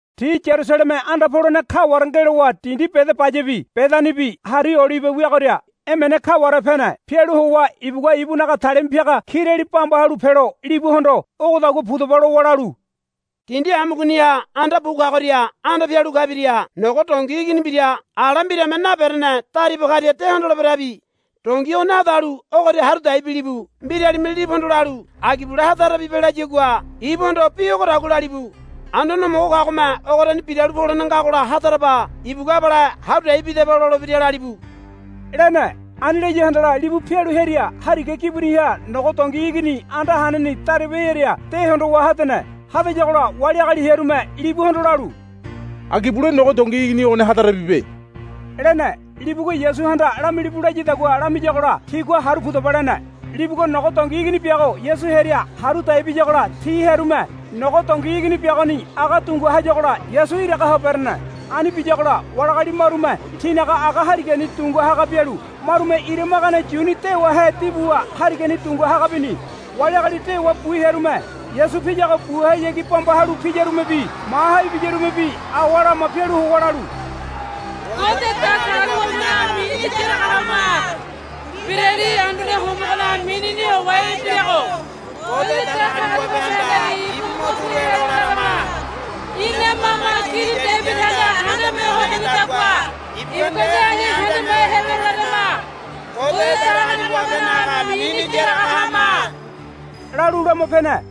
Ti Yarusaleme anda polene kaware ngelowa dindi Bedabayabi Bedanibi Hari Olibe weagoria emene kaware pene. Pialu howa ibugua ibunaga talima piaga kirali bamba halu pelo libuhondo, Ogodagua pudaba, lowa lalu, Dindi amugoniha anda bu kagoria anda pialu kabiria nogo dongi igini mbira ala mbirame naberene dariba karia de hondoleberabi. Dongi ogoni hadalu ogoria haru dai bilibu. Mbiralime libuhondo lalu, Agi bule hadarabibe, layagua ibuhondo bi ogodagua lalibu, Anduane Homogo kagome ogoriani biralu polene ngagola hadaraba. Ibugua abale haru dai bidaba lolebira, lalibu, lene. Ani laya handala libu pialu hearia hariga gibuniha nogo dongi igini anda haneni dariba hearia de hondowa hadene. Hadayagola wali agali hearume libuhondo lalu, Agi bule nogo dongi igini ogoni hadarabibe, lene. Libugua Yasuhanda lamilibu layadagua lamiyagola tigua, Haru pudaba, lene. Libugua nogo dongi igini biago Yasu hearia haru dai biyagola ti hearume nogo dongi igini biagoni aga dunga hayagola Yasu iraga ho berene. Ani biyagola wali agali marume tinaga aga harigani dunga haga bialu marume ira magane yuni dewahe dibuwa harigani dunga haga bini. Wali agali dewa bu hearume Yasu piyago buhayagi bamba halu piyarumebi maha ibiyarumebi awa lama pialu howa lalu, Ngode Datagaliwabenaga mini yaraga hama. Mbirali Anduane Homogonaga minini howa ibirago Ngode Datagaliwabehanda ibu mo turu helo larama. Ina mama Kini Debidihanda handame ho henedagua ibugua nde ani handame helo larama. Ngode Datagaliwabenaga mini yaraga hama, lalu lama pene.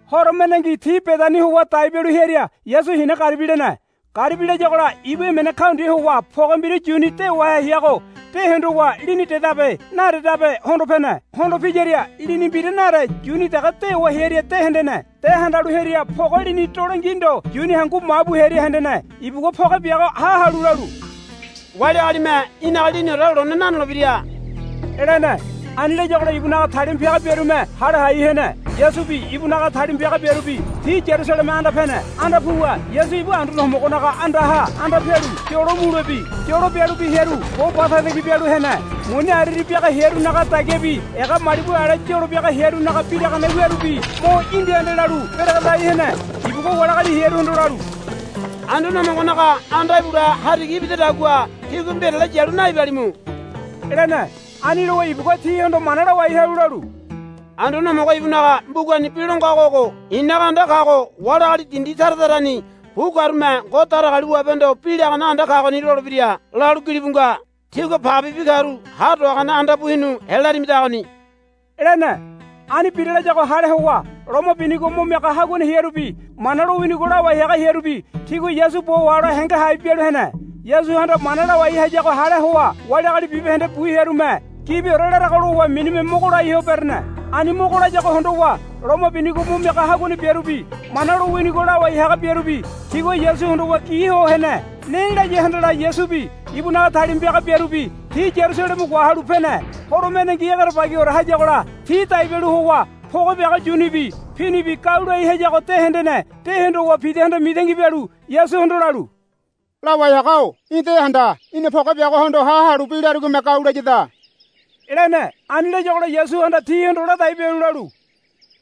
Horo mendengi ti Bedani howa dai bialu hearia Yasu hina garibi lene. Garibi layagola ibu emene kaundia howa poge mbira yuni dewahe heago de hondowa lini dedabe nadedabe hondo pene. Hondo piyaria lini mbira nade yuni dege dewa hearia de hendene. De handalu hearia poge lini dolengi ndo yuni hangu ma bu hearia hendene. Ibugua poge biago ha halu lalu, Wali agalime í̠naga liniore lone nanolebira, lene. Ani layagola ibunaga talima piaga biarume hale hai hene. Yasubi ibunaga talima piaga biarubi ti Yarusaleme anda pene. Anda puwa Yasu ibu Anduane Homogonaga andaha anda pialu yolo mulebi yolo bialubi hearu bo ba tagitagi bialu hene. Muni ariari biaga hearunaga dagiabi ega malibu ale yolo biaga hearunaga biragane wiarubi mo indi ande lalu beregedai hene. Ibugua wali agali hearuhondo lalu, Anduane Homogonaga anda ibule hariga ibidadagua tígua mbirale yalu naibalimu, lene. Ani lowa ibugua tihondo mana lawai halu lalu, Anduane Homogo ibunaga mbugani bi lo ngago ogo, I̱naga anda kago wali agali dindi tara tarani bu karume Ngode Datagaliwabehondo bi lagane anda kagoni, lolebira, lalu gilibu nga. Tígua pagebibi karu ha do hagane anda bu hinu helarimidagoni, lene. Ani bira, layagola hale howa loma binigo mo miaga haguane hearubi Mana lowinigo lawai haga hearubi tigua Yasu bo wahole henge hai bialu hene. Yasuhanda mana lawai hayago hale howa wali agali bibahende bu hearume, Gibiore larago, lowa minime mogo lai ho berene. Ani mogo layago hondowa loma binigo mo miaga haguane biarubi Mana lowinigo lawai haga biarubi tigua Yasu hondowa gi ho hene. Ne laya handala Yasubi ibunaga talima piaga biarubi ti Yarusaleme wahalu pene. Horo mendengi egerebagiore hayagola ti dai bialu howa poge biago yunibi pinibi gau lai hayago de hendene. De hondowa Pidahanda mitangi bialu Yasuhondo lalu, Lawai haga-o í̠ de handa. Í̠na poge biagohondo ha halu bi larigome gau layada, lene. Ani layagola Yasuhanda tihondo ladai bialu lalu,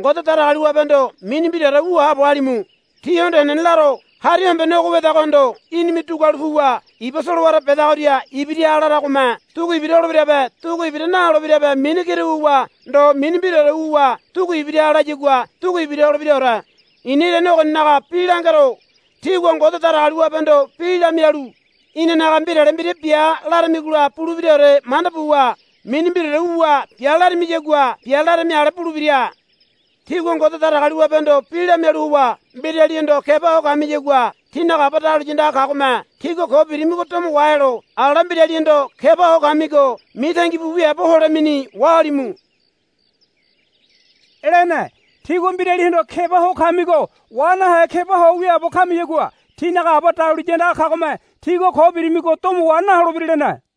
Ngode Datagaliwabehondo mini mbiraore wu haabo halimu. Tíhondo henene laro. Hari hombene ogo wedagohondo, Í̠nime dugualu puwa iba solowara bedagoria ibiraha, laragome dugu ibira holebirabe dugu ibira naholebirabe mini kira wuwa ndo mini mbiraore wuwa dugu ibiraha layagua dugu ibira holebiraore. I̱na irane ogoninaga bi langero. Tígua Ngode Datagaliwabehondo bi lamialu, Inanaga mbirale mbira bia, laramigola bulebiraore manda buwa mini mbiraore wuwa, Bia, laramiyagua bia larami ale bulebira. Tígua Ngode Datagaliwabehondo bi lamialu howa mbiralihondo keba ho kamiyagua tínaga Aba dahuliya andaga kagome tígua ko birimigo domo wahelo ala mbiralihondo keba ho kamigo mitangi bu wiaabo holemeni wahalimu, lene. [ Tígua mbiralihondo keba ho kamigo wa nahe keba ho wiaabo kamiyagua tínaga Aba dahuliya andaga kagome tígua ko birimigo domo wa naholebira, lene.]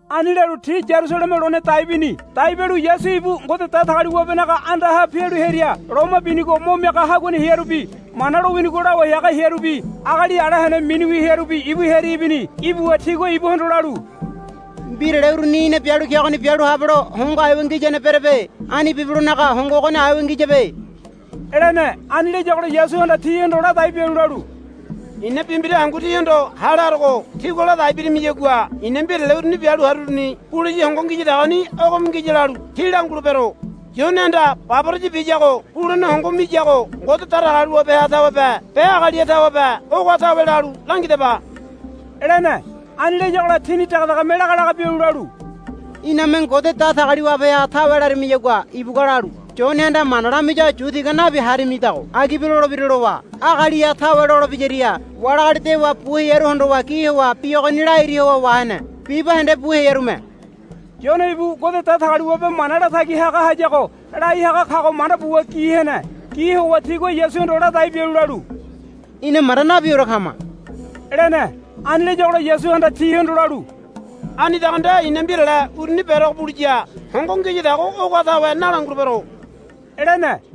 Ani lalu ti Yarusaleme lone dai bini. Dai bialu Yasu ibu Ngode Datagaliwabenaga andaha pialu hearia loma binigo mo miaga haguane hearubi Mana lowinigo lawai haga hearubi agali ala hene miniwi hearubi ibu hearia ibini. Ibuwa tigua ibuhondo lalu, Mbirale uruni í̠na bialu kegoni bialu habelo hongo aiwa ngiyane berebe. Ani bibelonaga hongo ogoni aiwa ngiyabe, lene. Ani layagola Yasuhanda tihondo ladai bialu lalu, I̱na bi mbira hangu tíhondo hale harogo tígua ladai birimiyagua i̱na mbirale uruni bialu haruruni buliya hongo ngiyadagoni ogome ngiya lalu tí langulebero. Yonehanda baboraya biyago bulene hongo miyago Ngode Datagaliwabeha tawebe be agaliha tawebe ogoha tawe lalu langidaba, lene. Ani layagola tini dege degeme laga laga bialu lalu, Iname Ngode Datagaliwabeha tawe larimayagua ibugua lalu, Yonehanda mana lamiyago yu tiga nabi harimidago agibe lolebira, lowa. Agaliha tawe, lolebiyaria wali agali dewa bu hearu hondowa gi howa bi ogoni lairi howa wahene. Bibahende bu hearume, Yone ibu Ngode Datagaliwabe mana latagi haga hayago, lai haga kago manda buwa gi hene. Gi howa tigua Yasuhondo ladai bialu lalu, Ina manda nabiore kama, lene. Ani layagola Yasuhanda tihondo lalu, Anidago nde i̱na mbirale uruni berogo buliya hongo ngiyadago ogoha tawe nalangulebero, lene.